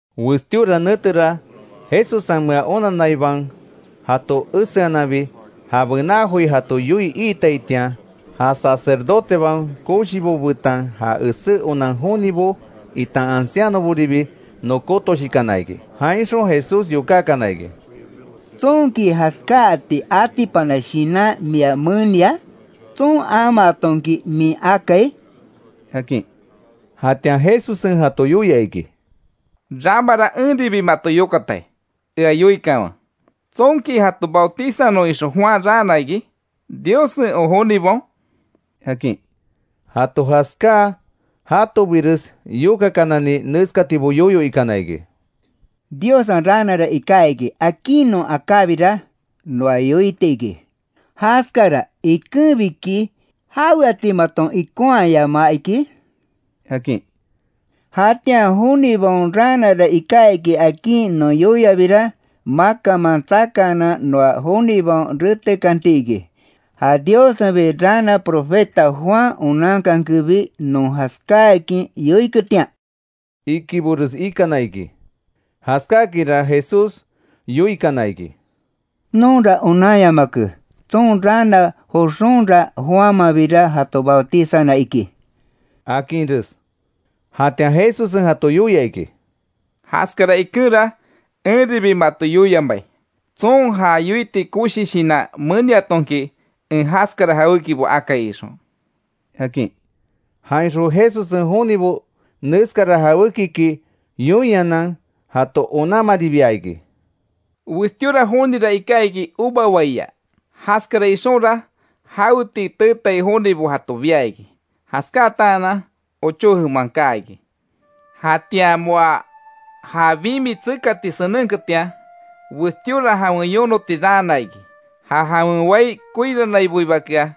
Westíora netera; Jesussenmea onanaibaon jato eseananbi, ja bená joi jato yoii iitaitian; ja sacerdotebaon koshibo betan ja esé onan jonibo itan ancianoboribi nokótoshikana iki. Jainxon Jesús yokákana iki: —¿Tsonki jaskáati atipana shinan mia menia? ¿Tson amaatonki min akai? —akin. Jatian Jesussen jato yoia iki: —Ramara enribi mato yokatai; ea yoikanwe. ¿Tsonki jato bautizanon ixon Juan raana iki, Diossen o jonibaon? —akin. Jato jaskáa, jatobires yokakanani neskatibo yoyo ikana iki: “Diossen raanara iká iki, akin non akábira, noa yoiti iki: ‘¿Jaskara ikenbiki jaweati maton ikonhayamaa iki?’ akin. Jatian jonibaon raanara iká iki akin non yoiabira, makanman tsakaanan noa jonibaon retekanti iki; ja Diossenbi raana profeta Juan onankankenbi, non jaskáakin yoiketian”, ikibores ikana iki. Jaskákinra Jesús yoikana iki: —Nonra onanyamake, tson raana joxonra Juanmanbira jato bautizana iki —akinres. Jatian Jesussen jato yoia iki: —Jaskara ikenra enribi mato yoiamai, tson ja yoiti koshi shinan meniatonki, en jaskara jawékibo akai ixon —akin. Jainxon Jesussen jonibo neskara jawékiki yoinhanan jato onanmaribia iki: “Westíora jonira iká iki uva waia. Jaskara ixonra jawetii teetai jonibo jato bia iki. Jaskáatanan ochó jeman kaa iki. Jatian moa ja bimi tsekati senenketian, westíora jawen yonoti raana iki, ja jawen wai koiranaiboibakea;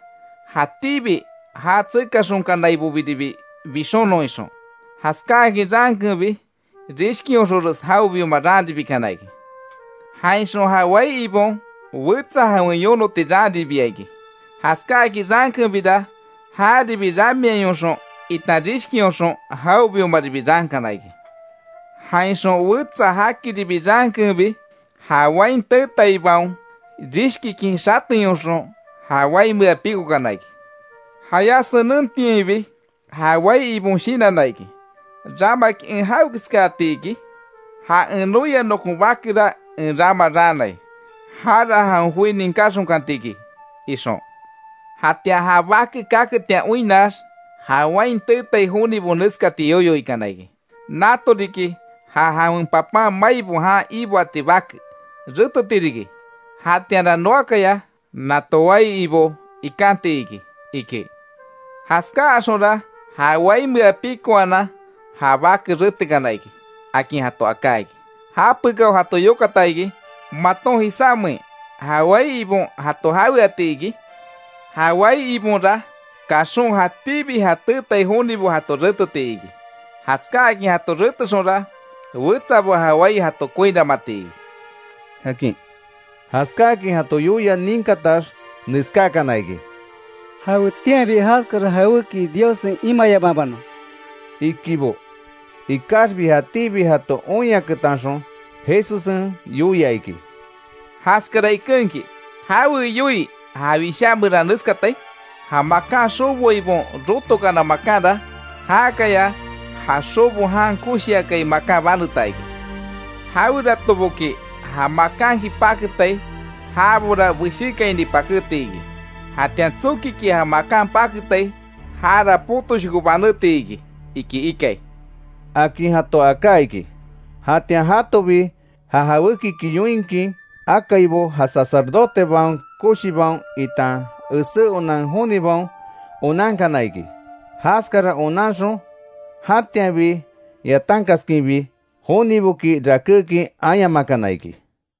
jatíbi ja tsekaxonkanaibobiribi bixonon ixon. Jaskáakin raankenbi, rishkionxonres jawebioma raanribikana iki. Jainxon ja wai ibon wetsa jawen yonoti raanribia iki: Jaskáakin raankenbira jaribi, ramiayonxon itan rishkionxon, jawebiomaribi raankana iki. Jainxon wetsa jakiribi raankenbi, ja wain teetaibaon rishkikin xateyonxon ja waimea pikokana iki. Jayá senentiainbi ja wai ibon shinanna iki: ‘¿Ramaki en jawekeskaati iki? Ja en noia nokon bakera en rama raanai, jara jawen joi ninkáxonkanti iki’, ixon. Jatian ja bake kaketian oinnax, ja wain teetai jonibo neskati yoyo ikana iki: ‘Nato riki ja jawen papan maibo jan iboati bake, reteti riki, jatianra noakaya nato wai ibo ikanti iki’, iki. Jaskáaxonra ja waimea pikoanan ja bake retekana iki”, akin jato aká iki. Japekao jato yokata iki: ¿Maton jisámein ja wai ibon jato jaweati iki? Ja wai ibonra kaxon jatíbi ja teetai jonibo, jato reteti iki; jaskáakin jato retexonra wetsabo ja wai jato koiranmati iki, akin. Jaskáakin jato yoia ninkatax neskákana iki: —¡Jawetianbi jaskara jaweki Diossen imayamabanon! —ikibo. Ikaxbi jatíbi jato oinyaketanxon Jesussen yoia iki: —Jaskara ikenki ¿Jawe yoii ja Wishá meran neskatai?: ‘Ja makan xoboaibaon, rotokana makanra, jakaya ja xobo jan koshiakai makan baneta iki’. Jaweratoboki ja makanki, paketai jabora beshékaini pakéti iki, jatian tsokiki ja makan paketai jara potoshoko banétiki iki ikai —akin jato aká iki. Jatian jatobi ja jawékiki yoinkin akaibo, ja sacerdotebaon koshibaon itan esé onan jonibaon onankana iki. Jaskara onanxon jatianbi yatankaskinbi, joniboki rakékin ayamakana iki.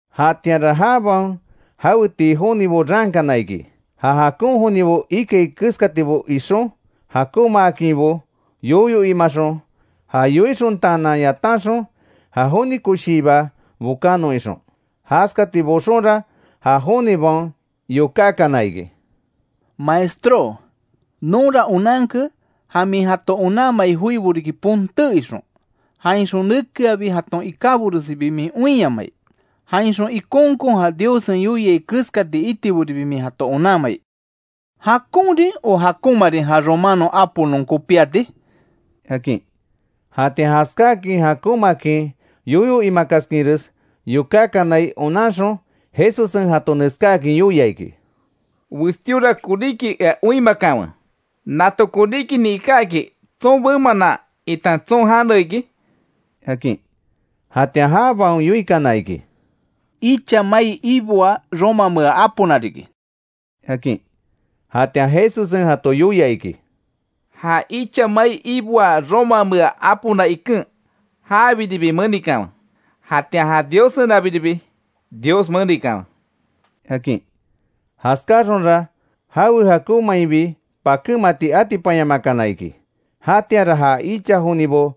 Jatianra jabaon jawetii jonibo raankana iki, ja jakon jonibo ikai keskatibo ixon, jakonmaakinbo yoyo imaxon, ja yoixontaanan, yatanxon ja joni koshiiba bokanon ixon. Jaskati boxonra, ja jonibaon yokákana iki: —Maestró, nonra onanke, ja min jato onanmai joibo riki ponté ixon; jainxon nekeabi jaton ikáboresibi min oinyamai. Jainxon ikonkon ja Diossen yoiai keskati itiboribi min jato onanmai. ¿Jakonrin o jakonmarin ja romano apo non kopíati? —akin. Jatian jaskáakin jakonmakin yoyo imakaskinres yokákanai onanxon, Jesussen jato neskáakin yoia iki: —Westíora koríki ea oinmakanwe, ¿Nato koríkinin ikáki, tson bemanan itan tson jane iki? —akin. Jatian jabaon yoikana iki: —Icha mai iboaa romamea apona riki —akin. Jatian Jesussen jato yoia iki: —Ja icha mai iboaa romamea apona iken, jabiribi menikanwe; jatian ja Diossenabiribi Dios menikanwe —akin. Jaskáaxonra jawe jakonmainbi pakémati atipanyamakana iki. Jatianra ja icha jonibo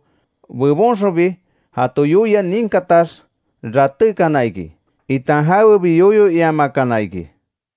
bebonxonbi jato yoia ninkatax ratékana iki, itan jawebi yoyo iamakana iki.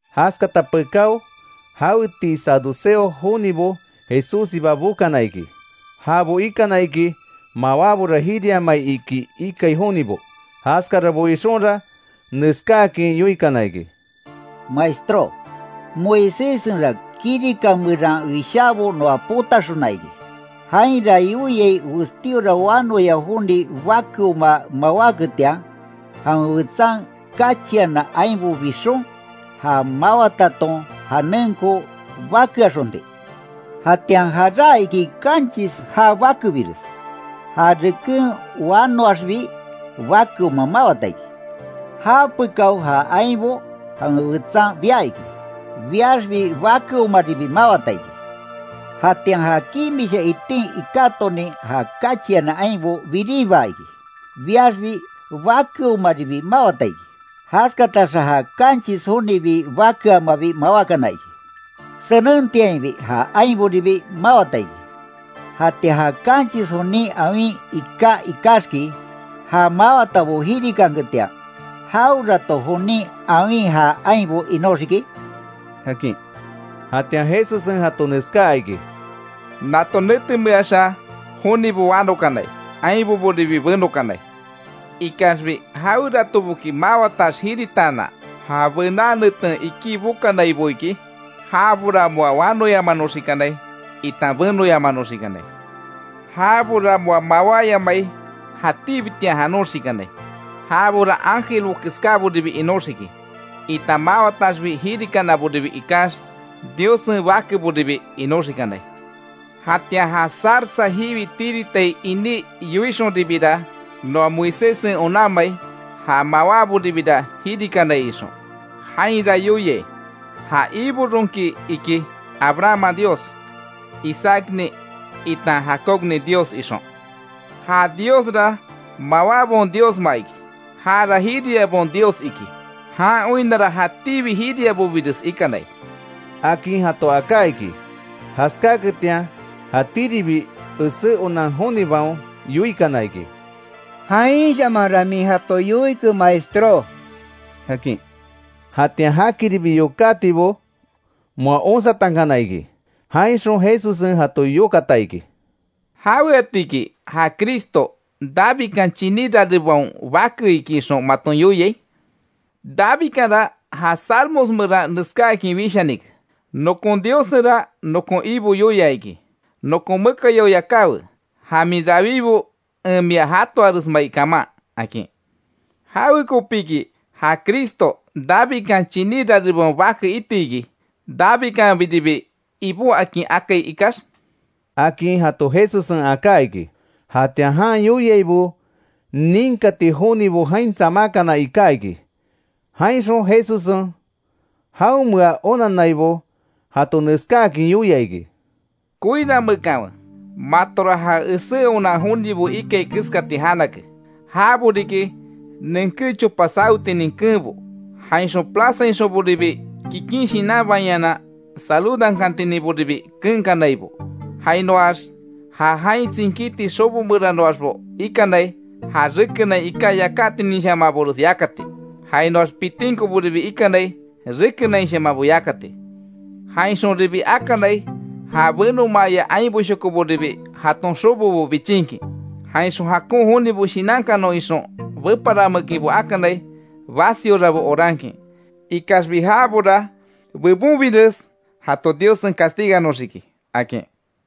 Jaskata pekáo, jawetii saduceo jonibo Jesússiba bokana iki. Jabo ikana iki mawábora jiriamai iki ikai jonibo. Jaskarabo ixonra neskáakin yoikana iki: —Maestró, Moiséssenra kirika meran wishaabo noa potaxona iki. Jainra yoiai westíora wanoya joni bakeoma mawáketian, jawen wetsan kachiana ainbo bixon; ja mawataton janenko bakeaxonti. Jatian jaráa iki kanchis ja bakebires. Ja reken wanoaxbi bakeoma mawata iki. Japekao ja ainbo jawen wetsan bia iki, biaxbi bakeomaribi mawata iki. Jatian ja kimisha itin ikátonin ja kachiana ainbo biribaa iki. Biaxbi bakeomaribi mawata iki. Jaskataxa ja kanchis jonibi bakeamabi mawákana iki. Senentiainbi ja ainboribi mawata iki. Jatian ja kanchis jonin awin iká ikaxki, ja mawatabo jirikanketian, ¿Jawerato jonin awin ja ainbo inóxiki? —akin. Jatian Jesussen jato neskaa iki: —Nato netemeaxa jonibo wanokanai, ainboboribi benokanai. Ikaxbi jaweratoboki, mawatax jiritaanan, ja bená neten iki bokanaibo iki, jabora moa wanoyamanoxikanai itan benoyamanoxikanai. Jabora moa mawáyamai jatíbitian janoxikanai. Jabora ángelbo keskáboribi inóxiki, itan mawataxbi jirikanaboribi ikax Diossen bakeboribi inoxikanai. Jatian ja zarza jiwi tiritai iní yoixonribira, noa Moiséssen onanmai ja mawáboribira jirikanai ixon. Jainra yoiai, ja Ibo ronki iki, Abrahamman Dios, Isaacnin itan Jacobnin Dios ixon. ¡Ja Diosra mawábaon Diosma iki; jara jiriabaon Dios iki. Jan oinnara jatíbi jiriabobires ikanai! —akin jato aká iki. Jaskáketian jatíribi esé onan jonibaon yoikana iki: —Jainshamanra min jato yoike maestró —akin. Jatian jakiribi yokátibo moa onsatankana iki. Jainxon Jesussen jato yokata iki: —¿Jaweatiki ja Cristo, Davidkan chiní rarebaon Bake iki ixon maton yoiai? Davidkanra ja Salmos meran neskáakin wishanike: ‘Nokon Diossenra nokon Ibo yoia iki: Nokon mekayao yakáwe, ja min rawibo en mia jatoaresmai kaman’, akin. ¿Jawekopiki ja Cristo, Davidkan chiní rarebaon bake iti iki, Davidkanbiribi Ibó akin akai ikax? —akin jato Jesussen aká iki. Jatian jan yoiaibo ninkati jonibo jain tsamákana iká iki; jainxon Jesussen jaonmea onannaibo jato neskáakin yoia iki: “Koiramekanwe, matora ja esé onan jonibo ikai keskati janake; jabo riki nenké chopa sawetinin keenbo, jainxon plazainxonboribi kikin shinanbainhanan saludankantininboribi keenkanaibo. Jainoax ja jain tsinkíti xobo meranoaxbo ikanai, ja rekenain iká yakátininshamanbores yákati, jainoax pitinkoboribi ikanai rekenainshamanbo yákati. Jainxonribi akanai ja benomaaya ainboshokoboribi jaton xobobo bichinkin, jainxon jakon jonibo shinankanon ixon beparanmekinbo akanai basiorabo orankin. Ikaxbi jabora bebonbires jato Diossen castiganoxiki”, akin.